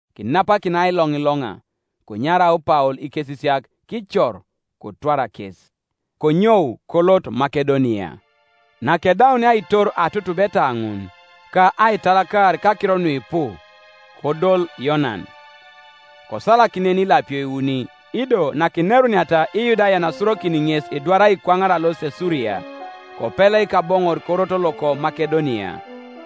Kinapakin ailoŋiloŋa, konyarau Paul ikesisiak, kicor, kotwar kes, konyou kolot Makedonia, Nakedaunia aitor atutubeta ŋun, ka aitalakar kakiro nuipu, kodol Yonan. Kosalak nen ilapio iuni, ido nakineruniata Iyudayan asurokin ŋes edwar aikwaŋar alosit Suria, kopeleik aboŋor korot loko Makedonia.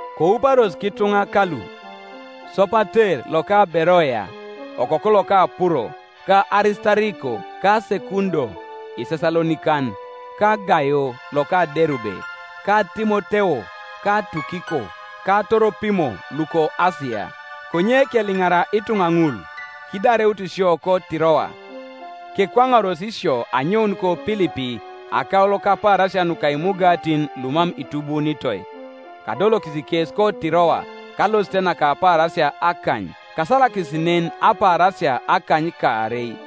Kouparos kituŋa kalu, Sopater loka Beroea, okoku loka Puro, ka Arisitariko ka Sekundo Isesalonikan; ka Gaio loka Derube, ka Timoteo; ka Tukiko ka Toropimo luko Asia. Konye keliŋara ituŋa ŋul, kidareut sio koTiroa, kekwaŋaros isio anyoun koPilipi akaulo kapaarasia nuka imugatin lumam itubuunitoi, kadolokis kes koTiroa kalosit naka apaarasia akany; kasalakis nen apaarasia akanykaarei.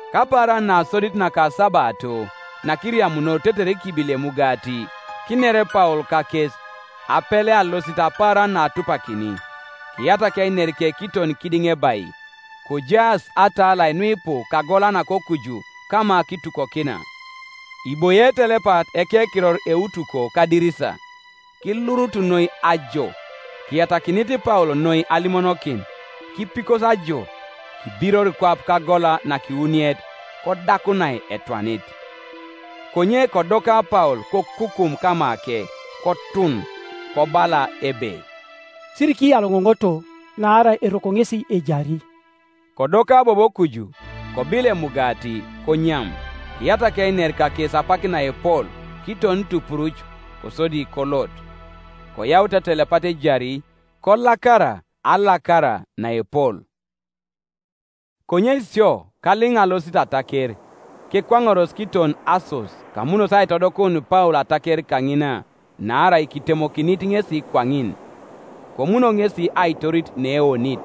Kapaaran nasodit nakasabato, nakiriamunor tetere kibili emugati, kiner Paul kakes, apele alosit apaaran naatupakini; kiyatak einerike kiton kidiŋebai. Kojaas atalai nuipu kagola nakokuju kama kitukokina. Iboie etelepat ekekiror Eutuko kadirisa; kilurutu noi ajo; kiyatakinit Paul noi alimonokin, kipikosi ajo, kibiror kwap kagola nakiwuniet, kodakunai etwanit. Konye kodoka Paul kokukum kamake, kotun, kobala ebe, “Sirikiyaloŋoŋoto; naarai eroko ŋesi ejari.” Kodoka bobo kuju, kobil emugati, konyam, kiyatak einer kakes apak naepol, kiton tupuruc, kosodi kolot. Koyaut etelepat ejari, kolakara alakara naepol. Konye sio kaliŋa alosit ataker, kekwaŋaros kiton Assos, kamunos aitodokun Paul ataker kaŋina; naarai kitemokinit ŋesi kwaŋin, komuno ŋes; aitorit neeonit,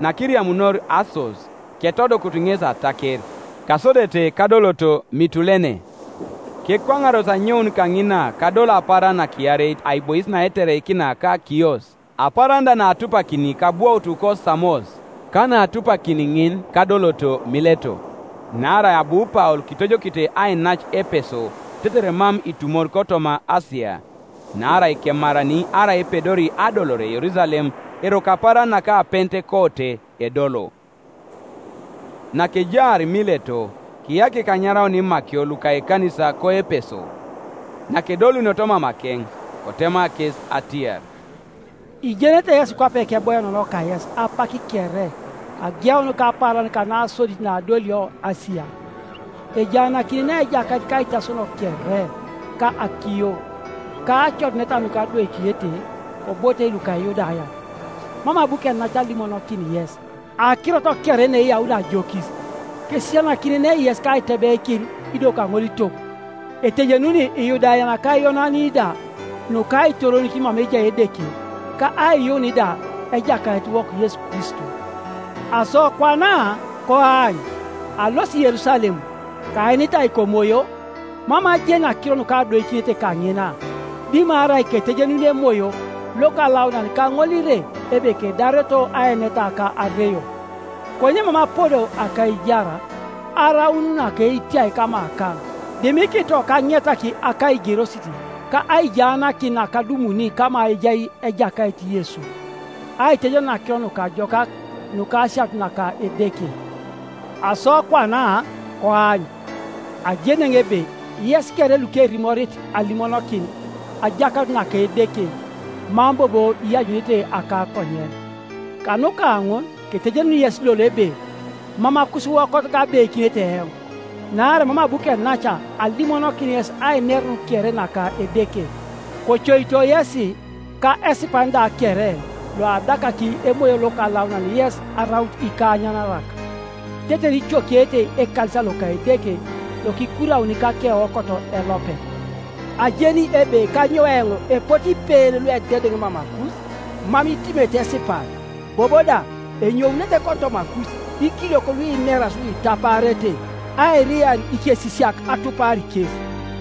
Nakiriamunor Assos, ketodokutu ŋes ataker, kasodete kadoloto Mitulene, Kekwaŋaros anyoun kaŋina kadolo apaaran nakiareit aibois naetereikina ka Kios; apaaran da naatupakini kabwoutu koSamos, ka naatupakini ŋin kadoloto Mileto. Naarai abu Paul kitojokite ainac Epeso tetere mam itumor kotoma Asia; naarai kemarani arai epedori adolore Yerusalem eroko apaaran naka Pentekote edolo. Nakejaar Mileto kiyakik anyaraun imakio luka ekanisa koEpeso. Nakedolunioto mamakeŋ, kotema kes atiar, “Ijenete yesi kwape keboienenoo kayes apak kere ageun kapaaran kanasodit naadolio Asia, ejaanakinenei Ejakait kaitasono kere, ka akiyo, ka acoduneta nukadoikinete kobotei luka Iyudayan, mam abu kenac alimonokin yes akirot kere naeyaun ajokis, kesisianakinenei yes kaitebeikin, ido kaŋolitog, etejenuni lyudayan ka Iyonanin da nuka aitoronikin mama ejai Edeke ka aiyuun da Ejakaitiwok Yesu Kristo. Aso kwana, koany, alosi Yerusalem, kaenitai komoyo, mam ajeni akiro nukadoikinete kaŋina, dimarai ketejenuni Emoyo Lokalaunan kaŋolire ebe kedareto aeneta ka areio. Konye mam apodo akaijar araun naketiai kamakaŋ, dimikito kaŋetak akaigerosit ka aijaanakin nakadumuni kama ejai Ejakait Yesu, aitejenun Akiro Nukajokak nuka asianut naka Edeke. Aso kwana, koany, ajeni eoŋ ebe yes kere lukerimorit alimonokin ajakanut naka Edeke mam bobo ianyunete akakonyen. Kanuka ŋun ketejenuni yes lolo ebe mam akusiwokot kabeikinete eoŋ, naarai mam abu kenac alimonokin yes ainerun kere naka Edeke. Kocoito yesi, ka esipan da kere loadakaki Emoyo Lokalaunan yes araut ikaanyanarak, tetere icokiete ekanisa loka Edeke, lokikurauni kakeokot elopet. Ajeni ebe kanyou eoŋ epote ipeen luededeŋ mamakus, mam itimete esipan; bobo da enyounete kotomakus ikiliok luineras nuitapaarete airiar ikesisiak atupar kes.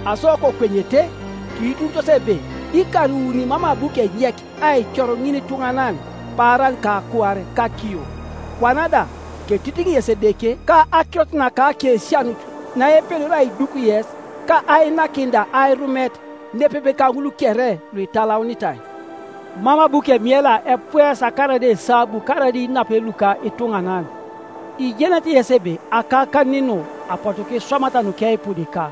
Asokokwenyete, kiitunitos ebe ikar iuni mam abu kenyek aicor ŋinituŋanan paaran ka kuar kakiyo. Kwana da ketitiŋ yes Edeke, ka akirot naka akesianut naepedori aiduk yes ka ainakin da airumet nepepe kaŋul kere luitalaunitai. Mam abu kemiela epuesa karaida esabu karaida inapen luka ituŋanan. Ijenete yesi ebe akakanin nu apotu kiswamata nukeipudika,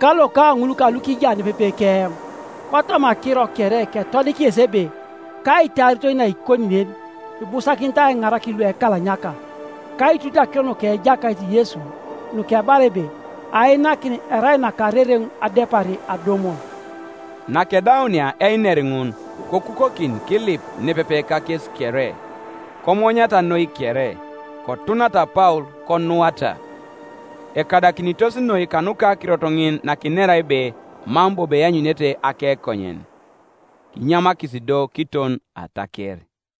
ka loka ŋul kalukija nepepe keoŋ. Kotoma akiro kere ketodik yes ebe kaitaaritoi naikoni nen ibusakinit aiŋarakin luekalanyaka, kaiitunite akiro nuka Ejakait Yesu, nukebala ebe, ‘Ainakin erai nakarereŋ adepar adumun.’” Nakedaunia einer ŋun kokukokin kilip nepepe kakes kere. Komonyata noi kere, kotunata Paul konuata. Ekadakinitos noi kanuka akirot ŋin nakinera ebe mam bobo eanyunete akekonyen. Kinyamakis do kiton ataker.